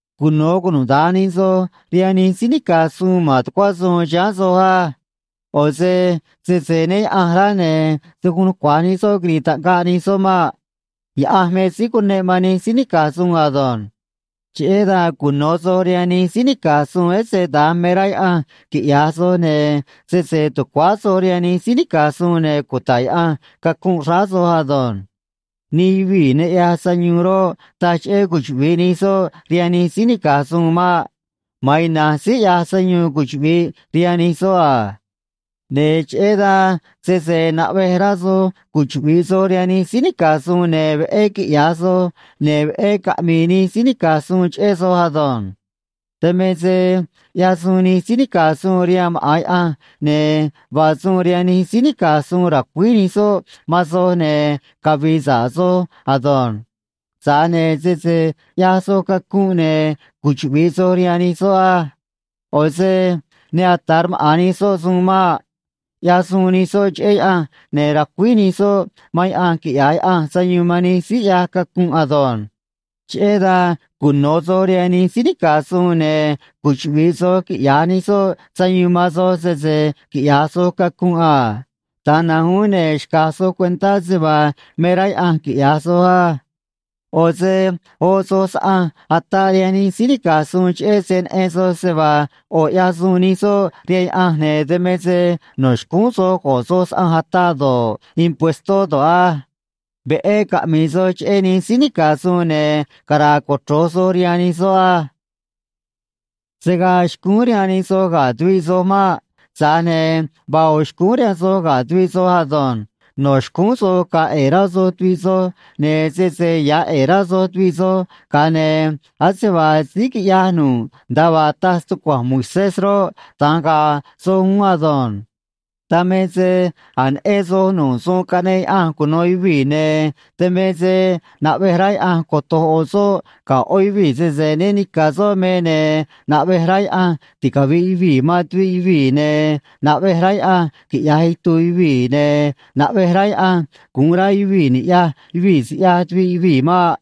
Cuno̱ cunuda̱nj nij soj rihaan nij síí nica̱j suun ma̱n tucuá suun chiháán soj á. ꞌO̱ se sese né Yaꞌa̱nj rá, ne̱ se̱ guun nucua̱j nij soꞌ quiri̱i̱ taꞌngaꞌ nij soꞌ maꞌ. Yaꞌanj me síí cuneꞌ man nij síí nica̱j suun ado̱nj. Cheꞌé dan cuno̱ soj rihaan nij síí nica̱j suun, ese da̱nj me rá Yaꞌanj quiꞌya̱j soj, ne̱ sese tucuáá soj rihaan nij síí nica̱j suun, ne̱ cuta̱ꞌ Yaꞌanj cacunꞌ xráá soj ado̱nj. Nij yuvii̱ ne ꞌyaj sayuun roꞌ, taj cheꞌé cuchuꞌvi̱ꞌ nij soꞌ rihaan nij síí nica̱j suun maꞌ. Ma̱an ina̱nj síí ꞌyaj sayuun cuchuꞌvi̱ꞌ rihaan nij soꞌ a. Ne̱ cheꞌé dan sese naꞌvej rá soj cuchuꞌvi̱ꞌ soj rihaan nij síí nica̱j suun, ne̱ veꞌé quiꞌya̱j soj, ne̱ veꞌé caꞌmi̱i̱ nij síí nica̱j suun cheꞌé soj ado̱nj. Dan me se ꞌyaj suun nij síí nica̱j suun rihaan maꞌa̱n Yaꞌanj, ne̱ vaa suun rihaan nij síí nica̱j suun ra̱cuíj nij soꞌ man soj, ne̱ cavi̱i̱ sa̱ꞌ soj ado̱nj. Tza̱j ne̱ sese ꞌyaj soj cacunꞌ, ne̱ cuchuꞌvi̱ꞌ soj rihaan nij soꞌ á. ꞌO̱ se ne ata̱ rmaꞌa̱n nij soꞌ suun maꞌ. ꞌYaj suun nij soꞌ cheꞌé Yaꞌanj, ne̱ racuíj nij soꞌ man Yaꞌanj quiꞌya̱j Yaꞌanj sayuun man nij síí ꞌyaj cacunꞌ ado̱nj. Cheꞌé dan cuno̱ soj rihaan nij síí nica̱j suun, ne̱ cuchuꞌvi̱ꞌ soj quiꞌya̱j nij soꞌ sayuun man soj sese quiꞌya̱j soj cacunꞌ a. Da̱nj na̱nj uún ne̱ xca̱j soj cuentá se vaa me rá Yaꞌanj quiꞌya̱j soj á. ꞌO̱ se oꞌ soj saꞌanj ataꞌ rihaan nij síí nica̱j suun, cheꞌé se neꞌen soj se vaa ꞌo̱ ꞌyaj suun nij soꞌ rihaan Yaꞌanj, ne̱ dan me se no̱ xcúún soj go̱ꞌ soj saꞌanj ataꞌ do̱ꞌ, impuestó do̱ꞌ á. Veꞌé caꞌmi̱i̱ soj cheꞌé nij síí nica̱j suun, ne̱ cara̱a̱ cochro̱j soj rihaan nij soꞌ á. Se̱ gaa xcúún rihaan nij soj ga̱ tuviꞌ soj maꞌ. Tza̱j ne̱ vaa ꞌo̱ xcúún rihaan soj ga̱ tuviꞌ soj ado̱nj. No̱ xcúún soj ga̱a̱ ꞌe̱e̱ rá soj tuviꞌ soj, ne̱ sese ya̱ ꞌe̱e̱ rá soj tuviꞌ soj, ga̱a ne̱ ase vaa síí quiꞌyaj nu̱ꞌ nda̱a vaa taj stucua̱nj Moisés roꞌ, da̱nj ga̱a̱ soj uún ado̱nj. Dan me se a̱j neꞌen soj nu̱ꞌ suun caꞌneꞌ Yaꞌanj cuno̱ yuvii̱, ne̱ dan me se naꞌvej rá Yaꞌanj coto̱j ꞌo̱ soꞌ ga̱ ꞌó yuvii̱ sese né ni̱ca̱ soꞌ me, ne̱ naꞌvej rá Yaꞌanj ticavi̱ꞌ yuvii̱ man tuviꞌ yuvii̱, ne̱ naꞌvej rá Yaꞌanj quiꞌya̱j itu̱u̱ yuvii̱, ne̱ naꞌvej rá Yaꞌanj gu̱un rá yuvii̱ ni̱ꞌyaj yuvii̱ siꞌyaj tuviꞌ yuvii̱ maꞌ.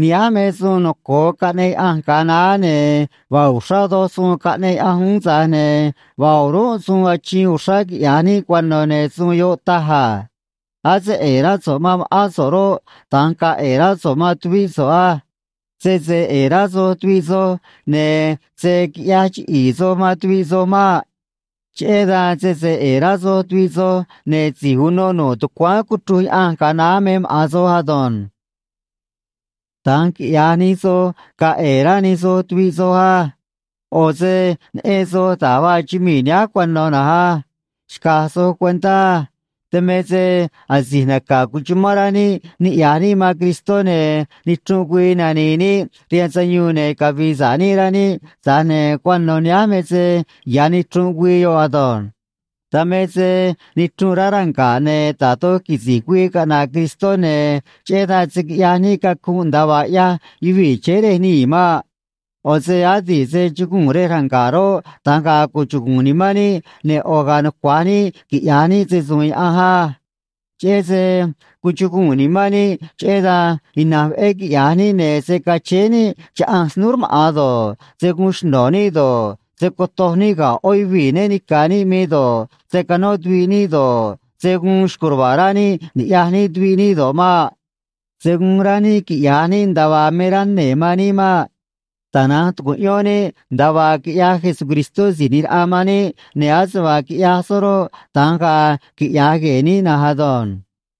Nihánj me suun noco̱o caꞌneꞌ Yaꞌanj ga̱a naá, ne̱ vaa uxrá doj suun caꞌneꞌ Yaꞌanj uún, tza̱j ne̱ vaa o̱rúnꞌ suun achiin uxrá quiꞌya̱j níꞌ cuano̱, ne̱ suun yoꞌ taj a: “A̱ se ꞌe̱e̱ rá so̱ꞌ man ma̱ꞌán so̱ꞌ roꞌ, da̱nj ga̱a̱ ꞌe̱e̱ rá so̱ꞌ man tuvíꞌ so̱ꞌ á.” Sese ꞌe̱e̱ rá soj tuviꞌ soj, ne̱ se̱ quiꞌyaj chiꞌi̱i̱ soj man tuviꞌ soj maꞌ. Cheꞌé dan sese ꞌe̱e̱ rá soj tuviꞌ soj, ne̱ si̱j uno nu̱ꞌ tucuáán cuchruj Yaꞌanj ga̱a naá me maꞌa̱n soj ado̱nj. Da̱nj quiꞌya̱j nij soj, ga̱a̱ ꞌe̱e̱ rá nij soj tuviꞌ soj á. ꞌO̱ se neꞌen soj da̱j vaa chumii̱ nihánj cuano̱ na̱nj á. Xca̱j soj cuentá á. Dan me se asi̱j naca̱ cuchumán rá níꞌ niꞌya̱j níꞌ man Cristó, ne̱ nichrunꞌ güii nani̱i̱ níꞌ rihaan sayuun ne̱ cavi̱i̱ sa̱ꞌ níꞌ, rá níꞌ, tza̱j ne̱ cuano̱ nihánj me se ya̱ nichrunꞌ güii yoꞌ ado̱nj. Dan me se nichrunꞌ rá ranga̱ꞌ, ne̱ da̱j doj quisi̱j güii caꞌna̱ꞌ Cristó, ne̱ cheꞌé dan se̱ quiꞌyaj níꞌ cacunꞌ nda̱a vaa ꞌyaj yuvii̱ chéé rej nii̱ maꞌ. ꞌO̱ se adi̱ꞌ se chuguu̱n rej ranga̱ꞌ roꞌ, da̱nj ga̱a̱ cuchugu̱u̱n nimán níꞌ, ne̱ ꞌo̱ ga̱a̱ nucua̱j níꞌ quiꞌya̱j níꞌ se‑su̱u̱n Yaꞌanj á. Cheꞌé se cuchugu̱u̱n nimán níꞌ, cheꞌé dan ina̱nj veꞌé quiꞌya̱j níꞌ, ne̱ se̱ cachéé níꞌ chaꞌanj snúú rmaꞌa̱n do̱ꞌ, se̱ guun xno̱ níꞌ do̱ꞌ, se̱ cotoj níꞌ ga̱ ꞌó yuvii̱ né ni̱ca̱ níꞌ me do̱ꞌ, se̱ canó tuviꞌ níꞌ do̱ꞌ, se̱ guun xco̱j ruva̱a̱ rá níꞌ ni̱ꞌyaj níꞌ tuviꞌ níꞌ do̱ꞌ maꞌ. Se̱ guun rá níꞌ quiꞌya̱j níꞌ nda̱a vaa me rá nee̱ man níꞌ maꞌ. Tana̱nj tu̱cuꞌyón níꞌ nda̱a vaa quiꞌyaj Jesucristó Si̱j ꞌNi̱j Raꞌa man níꞌ, ne̱ ase vaa quiꞌyaj soꞌ roꞌ, da̱nj ga̱a̱ quiꞌya̱j gue̱e̱ níꞌ na̱nj ado̱nj.